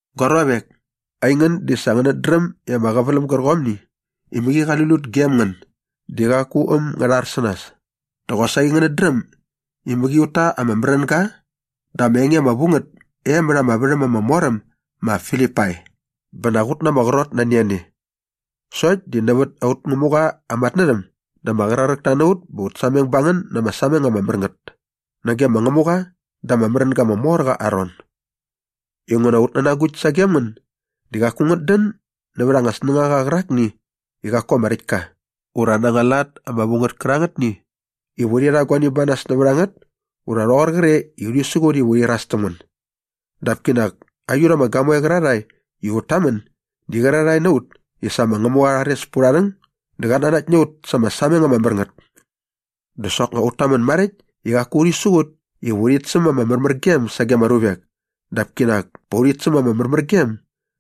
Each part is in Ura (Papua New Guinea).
Gua ruavek, aingän di sa ngänät dräm i ama qäväläm gärqomni i mäqi qali lut gem ngän di qaku äm ngä rhar sä nas. Dä qosaqi ngänät dräm i mäqi ut ta ama märänga dä ama enge ama vu ngät e mät ama värhäm ama mor äm ma Filipai bä nak ut na ama qrot nani a ne. Sokt di nävät aut Ngämuqa aa matnärhäm dä ama qraräkta na ut bä ut sameng ba ngän na ama sameng ama mär ngät nage ma Ngämuqa da ama märänga ama mor qa aa ron. Inguna aut nänagukt sagem ngän di qaku ngät dän nävät anga snängaqa qärakni i qaku ama räkt ka ura na anga lat ama vu ngät kärangätni iva urhi rha guani ba nas nävät a ngät ura rhoqor qre iva urhi siqut iva urhi iras täm ngän. Dap kinak aiut ama gamoe qärarhae i ut tamän di qärarhae na ut i sa ma Ngämuqa qa rhares pät urha rhäng dä qat nanakt na ut sa ama sameng ama mär ngät. Dä soknga ut tamän maräkt i qaku urhi siqut iva urhit säm ama märmärgem sage ama ruvek dap kinak pa urhit säm ama märmärgem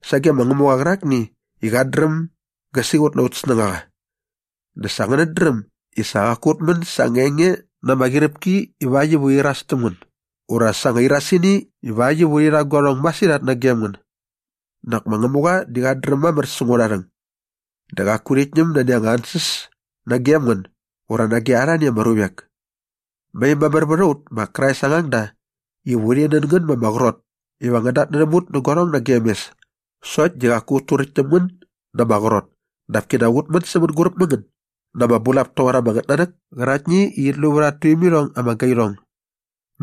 sage ma Ngämuqa qärakni i qat dräm gä siqut na aut snängaqa. Dä sa ngänät dräm i sa qaku ut män sa anga enge na ama qyiräpki ivakt iva urhi iras täm ngän ura sa anga irasini ivakt iva urhi rha guarhong masirhat nagem ngän. Nak ma Ngämuqa di qat dräm mamär säng aurha rhäng. Dä qaku urhit ñäm nani anga ansäs nagem ngän ura nage arhani ama ruvek. Mai mamär vät a ut ma Krais aa ngangda iva urhi nän ngän ma ama qrot iva ngän datnärhäm ut nä guarhong nagem mes sokt di qaku ut turäkt täm ngän na ama qrot dap kinak ut män sä mänguräp mä ngän na ama bulap toqor anga ngätnanäk käraktni i qit lu vät at tuimirhong ama gairhong.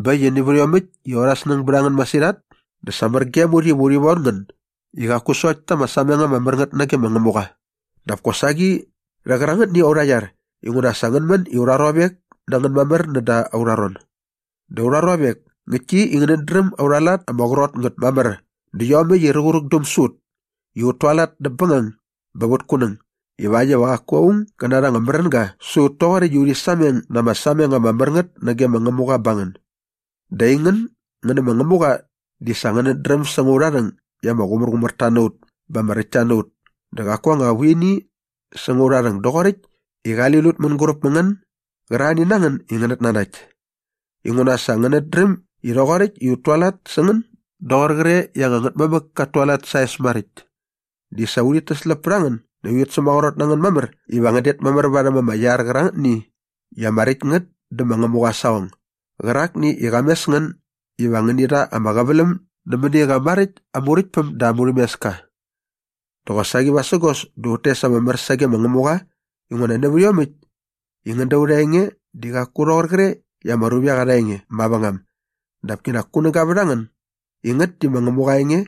Bä äkt i nävät iomäkt i aurha snäng bät a ngän masirhat dä sa mär gem ut iva urhi von ngän i qaku sokt ta ama sameng ama mär ngät nage ma Ngämuqa dap kosaqi rhä qärangätni aurha iar inguna sa ngän män i aurha ruavek na ngän mamär näda aurha ron. Dä aurha ruavek, ngäktki i ngänät dräm aurha lat ama qrot ngät mamär dä iomäkt i ruqärukdäm sä ut i ut tualat näp bängang bä vät kunäng ivakt iva qaku aung gä narha anga märänga sä ut toqoräkt i urhi sameng na ama sameng ama mär ngät nage ma Ngämuqa ba ngän. Dä aingän ngän nä ma Ngämuqa di sa ngänät dräm säng aurha rhäng i ama qumärqumärta na ut bä ama räktta na ut dä qaku anga vuini säng aurha rhäng doqoräkt i qali lut mänguräp mä ngän gärarhani na ngän i ngänät nanakt. Inguna sa ngänät dräm i rhoqoräkt i ut tualat sä ngän doqor qre i anga ngätmamäk kat tualat sa aa es maräkt di sa urhit täsläp pät a ngän näkt urhit sämaqrot na ngän mamär iva ngän det mamär varhäm ama iar qärangätni i ama räkt ngät dä ma Ngämuqa aa saqong gärakni i qa mes ngän iva ngäni rha ama qäväläm nämäni qa maräkt aa Muräktpäm dä aa murhämeska. Dä qosaqi vasägos dä ut tes ama mär sage ma Ngämuqa inguna nävät iomäkt i ngän da aurha enge di qaku rhoqor qre i ama ruvek arha enge mavängam dap kinak kunäga vät a ngän i ngät di ma Ngämuqa aa enge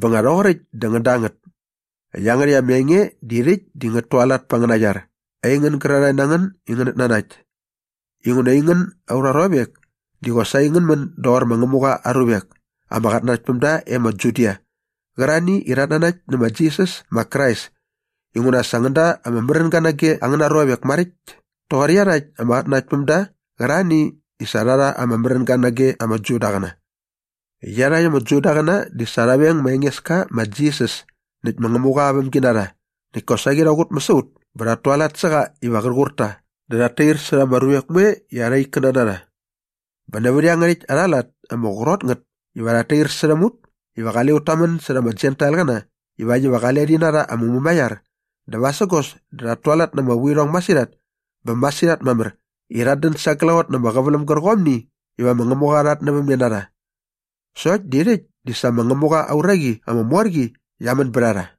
bä nga rhoqoräkt dä ngän da ngät. Iangärhäkt ama enge di rhäkt di ngät tualat pät angäna iar aingän gärarhae na ngän i ngänät nanakt. Inguna aingän aurha ruavek, di qosaqi ngän män doqor ma Ngämuqa aa ruvek ama qatnanaktpämda e ma Judia qärarhani i rhat nanakt nä ma Jisas ma Krais inguna sa ngän da ama märänga nage angäna ruvek maräkt toqor iarhakt ama qatnanaktpämda qärarhani i sa rha rha ama märänga nage ama Judaqäna. Iarhakt ama Judaqäna di sa rha veng ma Engeska ma Jisas näkt ma Ngämuqa aa vämginarha näkt kosaqi rha qutmäs a ut bä rhat tualat sä qa iva qär qur ta dä rhat tair särha ama ruvek moe i arha ikkäna na rha. Bä nävät iangärhäkt arha lat ama qrot ngät iva rhat tair särhäm ut iva qale ut tamän särha ama Jentailqäna ivakt iva qale rhi narha ama mumaiar dä vasägos dä rhat tualat na ama vuirhong masirhat bä masirhat mamär i rhat dän sa glaqot na ama qäväläm gärqomni iva ma Ngämuqa qa rhatnävämne na rha. Sokt di rhäkt di sa ma Ngämuqa aa uraqi ama mor qi qia män bät a rha.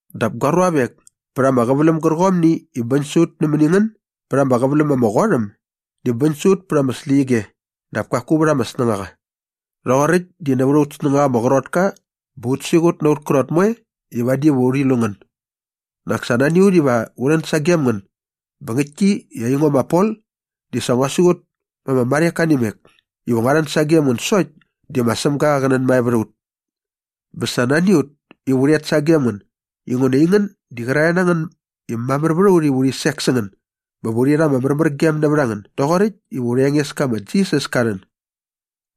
Dap gua ruavek, pät ama qäväläm gärqomni i bäñ sä ut nämäni a ngän bät ama qäväläm ama qot äm di bäñ sä ut pät ama släqyige dap kaku vät ama snängaqa. Rhoqoräkt di nävät aut snängaqa ama qrot ka bä ut siqut na aut krot moe i vadi va urhi lu ngän. Nak sa nani a ut iva u rhän sagem ngän bä ngäktki i aingo ma Pol di sa ngua siqut ma ama marheka nä imek iva ngua rhän sagem ngän sokt di ma Sämga qä nänmae vät a ut. Bä sa nani a ut iva u rhet sagem ngän inguna aingän di qärarhae na ngän i mamär vät a ut iva urhi sek sä ngän bä va urhi rha ama märmärgem nävät a ngän doqoräkt iva aurha Engeska ma Jisas ka rhän.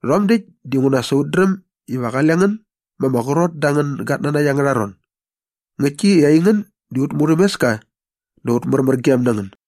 Rhom däkt dinguna sa ut dräm iva qale ngän ma ama qrot da angän gatnanakt angärha ron. Ngäktki i aingän di aut murhämeska dä aut märmärgem na ngän.